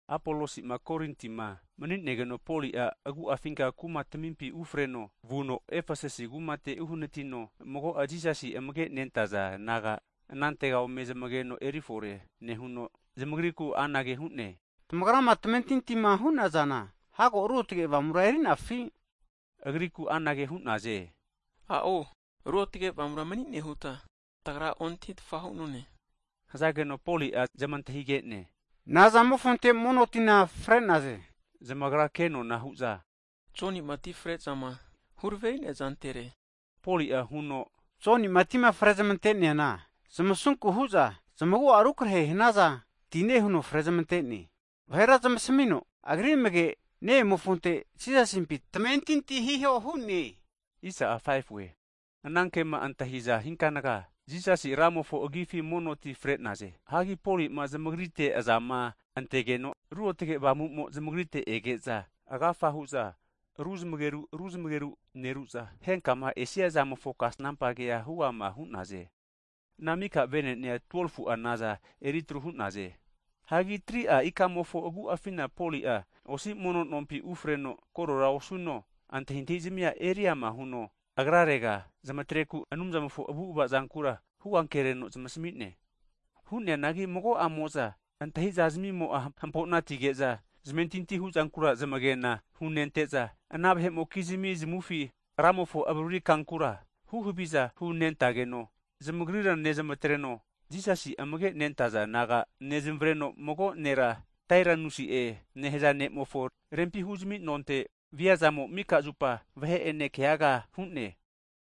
Apolosi'ma Korintima mani'negeno, Poli'a agu'afinka kuma tamimpi ufreno vuno Efesasi kumate uhnatino, mago'a disaipol naga anantega ome zamageno erifore nehuno, zamagriku anage hu'ne, tamagra ma tamentintima hu'nazana, hago Ruotge Avamura erinafi? Agriku anage hu'naze. A'o Ruotge Avamura mani'ne huta tagra ontahitfa hu'none. Hazageno Poli'a zamantahige'ne, Nazamofonte mono tina fre'naze? Zamagra ke'nona hu'za, Joni'ma ti fre'zama huraveri'nea zantere. Poli'a huno, Joni'ma tima frezmante'neana, zamasunku hu'za zamagu'a rukarehe hanaza tine huno frezmantene. Vahera zamasmino, agri amage'ma ne'emofonte Jisasimpi tamentinti hiho hu'ne. Anankema antahite'za, Jisasi Ramofo agifi mono ti fre'naze. Hagi Poli'ma zamagrite azama antegeno'a, Ruotge Avamu'mo'a zamagrite ege'za, agafa hu'za ruzamageru ruzmageru neru'za, henkama esiazamofo kasnampa kea huama hu'naze. Ana mika vene'nea 12fu'a naza eritru hu'naze. Hagi 3'a ikamofo agu'afina, Poli'a osi mono nompi ufreno korera osuno, antahintahizamia eriama huno agrarega zamatreku Anumzamofo avu'ava zankura huankereno zamasmi'ne. Hu'neanagi mago'amo'za antahi'za zami'mo'a hampo'na atige'za, zamentinti hu'zankura zamagena hunente'za, ana vahe'mokizmi zamufi Ramofo avariri kankura huhaviza hunentageno, zamagrira nezamatreno, Jisasi amage' nentaza disaipol naga nezamavreno, mago nera Tairanusi'e nehaza ne'mofo rempi huzami nonte via'zamo, mika zupa vahe'ene keaga hu'ne.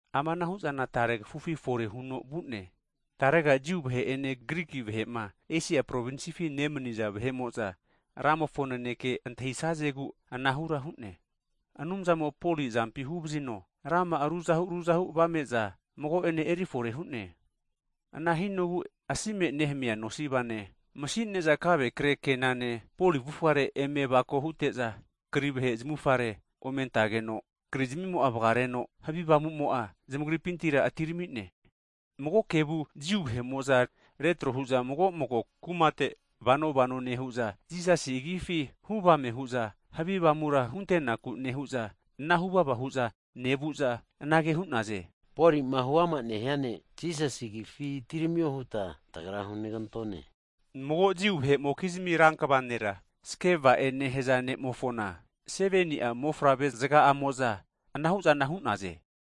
Amanahu'zana tare kafufi fore huno vu'ne, tarega Jiu vahe'ene Griki vahe'ma Esia provinsifi nemani'za vahe'mo'za Ramofo naneke antahi'sazegu anahura hu'ne. Anumzamo'a Poli azampi huvazino rama'a ruzahu ruzahu avame'za mago'ane erifore hu'ne. Ana hinogu asi'me nehamia nosivane (ankasipimo'ene), masine'za kave kre kenane (apronimo'a), Poli avufare eme avako hute'za, eri'za kri vahe zamufare ome antageno, krizmimo'a vgaregeno, havi avamumo'a zamagripintira atirami'ne. Mago kevu Jiu vahe'mo'za retro hu'za mago mago kumate vano vano nehu'za, Jisasi agifi huvame hu'za havi avamura huntenaku nehu'za, ana huvava hu'za nevu'za anage hu'naze. Poli'ma huama nehia Jisasi agifi atiramio huta tagra hunegantone. Mago Jiu vahe'mokizmi rankva nera Skeva'e nehaza ne'mofona, 7ni'a mofavre zga'amo'za anahu'zana hu'naze.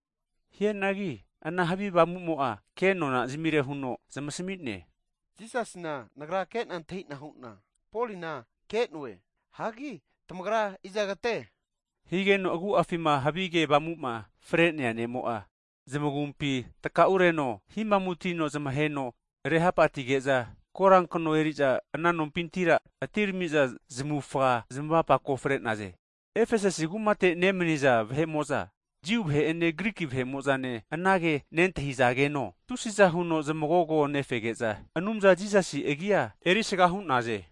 Hianagi ana havi avamu'mo'a ke'nona zamire huno zamasmi'ne, Jisasina nagra ke'na antahi'na hu'na, Polina ke'noe, hagi tamagra izagate? Higeno agu'afima havige avamu'ma fre'nea ne'mo'a zamagumpi takaureno, himamutino zamaheno rehapatige'za, korankno eneri'za ana nompinti atiramiza zamufa zamapake fre'naze. Efesasi kumate nemaniza Jiu vahe'ene Griki vahe'mo'zane ana ke nentahizageno, tusiza huno zamagogo nefege'za Anumza Jisasi agi'a erisaga hu'naze.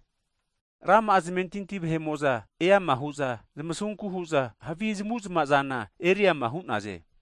Rama'a zamentinti vahe'mo'za eama hu'za zamasunku hu'za, havi zamu'zma'zana eriama hu'naze.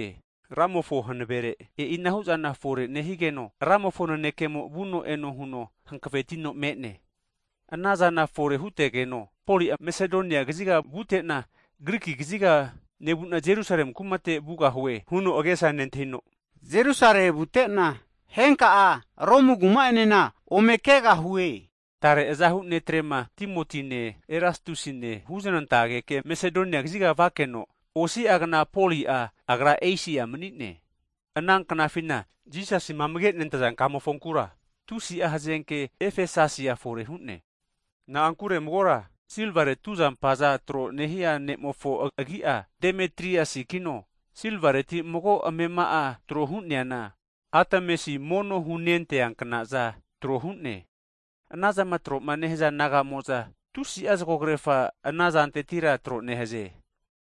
Ramofo hanavere, e'inahu'zana fore nehigeno, Ramofo nanekemo vuno eno huno hankavetino me'ne. Anazana fore hutegeno Poli'a Masedonia kaziga vute'na Griki kaziga nevu'na Jerusale kumate vute'na, henka'a Romu kuma enena ome kegahue huno agesa antahine. Tare azahu netrema, Timotine Erastusine huzanantegeke Masedonia kaziga vakeno, osi'agna Poli'a, agra Esia mani'ne. Ana knafina, Jisasi Kamofonkura tusi'a hazenke Efesasia fore hu'ne. Na'ankure magora silvare tuzampaza tro nehia ne'mofo agi'a Demetriasikino, silvareti mago amema'a trohu'neana, Atemasi mono hunentea kna'za tro hu'ne. Anazama tro'ma nehaza naga'mo'za, tusi'a zgokrerafa anazantetira tro'nehaze.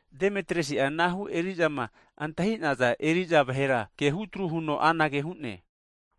Demetriasi'a anahu erizama antahi'naza eri'za vahera kehutru huno anage hu'ne.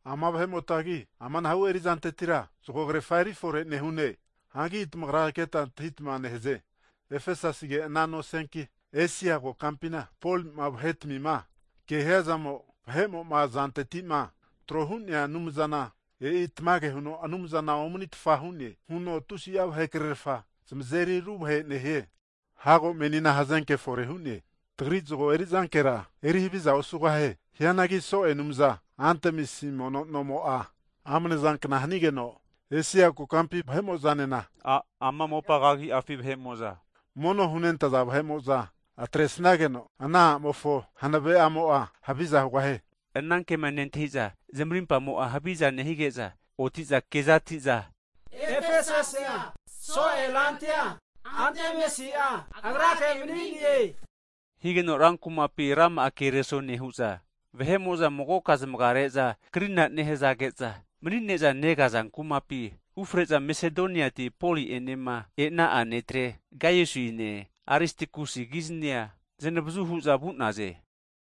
Ama vahe'motagi, amanahu eri'zantetira zgogrerafa erifore nehune hu'ne. Hanki tamagra ketma antahitma nehaze, Efesasige ana nosianki, Esia kokampina Polima vahetamima kehiazamo, vahe'mo'ma azanteti'ma trohu'nea anumzana, e'i tamage huno anumzana omanitfa hune huno tusi'a vahe krerafa zamazeri ruvahe nehie. Hago menina hazenke fore hu'ne, tagri zgo erizankera eri havizana osugahie. Hianagi so'e a' anumza Atemisi mono nomo'a amne zankna hanigeno, Esia kokampi vahe'mo'zane, ama mopa kagi'afi vahe'mozama, mono hunentaza vahe'mo'za atre'sageno, ana a'mofo hanave'amo'a haviza hugahie. Anankema nentahi'za, zamarimpamo'a haviza nehige'za oti'za keza ati'za Efesasia so'e rantia, Atemisi'a agrake mani'ne! Higeno rankumapina rama'a kereso nehu'za, vahe'mo'za magoka zamagare'za krina nehazage'za mani'neza negaza kumapi (stetium) ufre'za, Mesadoniati Poli'enema e'na'a netre Gaiusine Aristakusikiznia zanavazu hu'za vu'naze.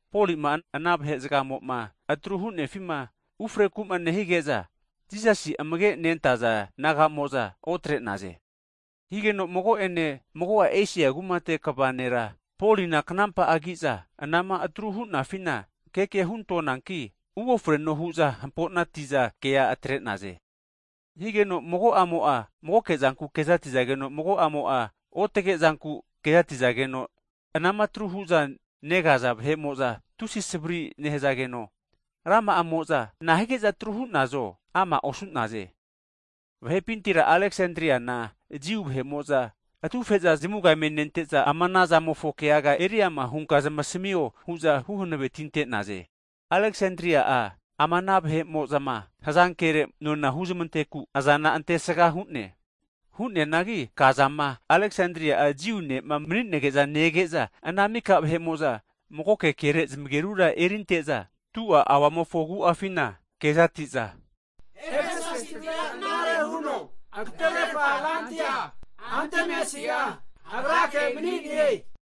Poli'ma ana vahe'zgamo'ma atru hu'nefima ufreku'ma nehige'za, Jisasi amage nentaza disaipol naga'mo'za otre'naze. Higeno mago'ene mago'a Esia kumate kva vahera, Polina knampa'agi'za anama atru hu'nafina keke huntonanki uofreno hu'za hampo'nati'za kea atrente'naze. Higeno mago'amo'a magoke zanku kezati'zageno, mago'amo'a otage zanku kezati'zageno, anama atru hu'za negaza vahe'mo'za tusi savari nehazageno, rama'amo'za nahige'za atru hu'nazo ama'osu'naze. Vahe'pintira Aleksandana Jiu vahe'mo'za atufe'za zamuga eme nente'za, ama ana zamofo keaga eriama hunka zamasmio hu'za huhanavetinaze. Aleksanda'a ama ana vahe'mo'zama hazankere nona huzmanteku azana antesga hu'ne. Hu'neanagi kazama Aleksanda'a Jiu ne'ma mani'nege'za nege'za, ana mika vahe'mo'za magoke kere zamagerura erinte'za, 2'a auamofo agu'afina kezati'za, Efesasitira knare huno agatererfa rantia, Atemisi agrake mani'ne!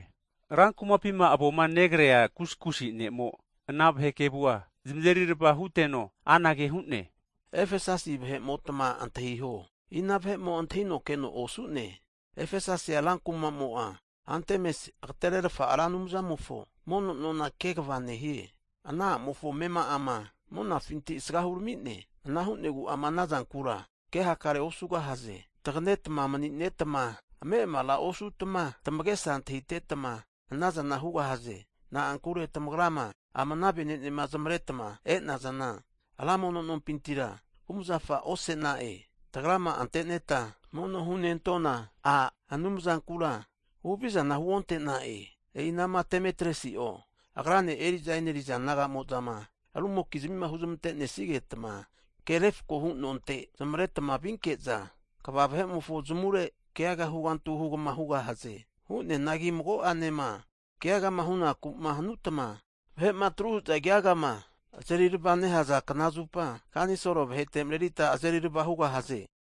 Rankumapima avoma negrea (kuskus) ne'mo ana vahe kevua zamazeri rava huteno anage hu'ne. Efesasi vahe'motma antahiho, ina vahe'mo antahino keno osu'ne? Efesasia ranku'mamo'a Atemasi agetererfa ra anumzamofo mono nona kegva nehie. Ana a'mofo amema'ama monafinti'ma asga hurami'ne. Ana hu'negu ama anazankura ke hakare osugahaze, taganetma mani'netma ame'amara osutma tamage'sa antahitetma anazana hugahaze. Na'ankure tamagra ma, ama ana vene'nema zamaretma e'nazana, ra mono nompintira kumazafa ose'na'e, tagrama anteneta mono hunentona a' anumzankura (goddess) huhavizana huonte'na'e. E'ina'ma Demetriasi'o agrane eri'za eneriza naga'mo'zama rumokizmima huzmante'nesigetma ke refakohu nonte zamaretma vinke'za, kva vahe'mofo zamure keaga hugantu hugama hugahaze. Hu'neanagi mago'anema keagama hunaku hanutma, vahe'ma atruhu'za keagama azerirva nehaza knazupa kanisol vahete mareritma azerirava hugahaze.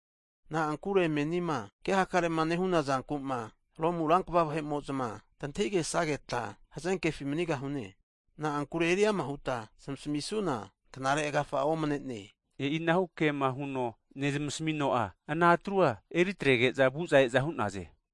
Na'ankure menima ke hakarema nehuna zankuma, Romu rankva vahe'mo'za tantahigesageta hazenkefi manigahune. Na'ankure eriama huta zamasmisuna knare agafa'a omane'ne. E'inahu kema huno nezmasmino'a, ana atrua eritrege'za vuza e'za hu'naze.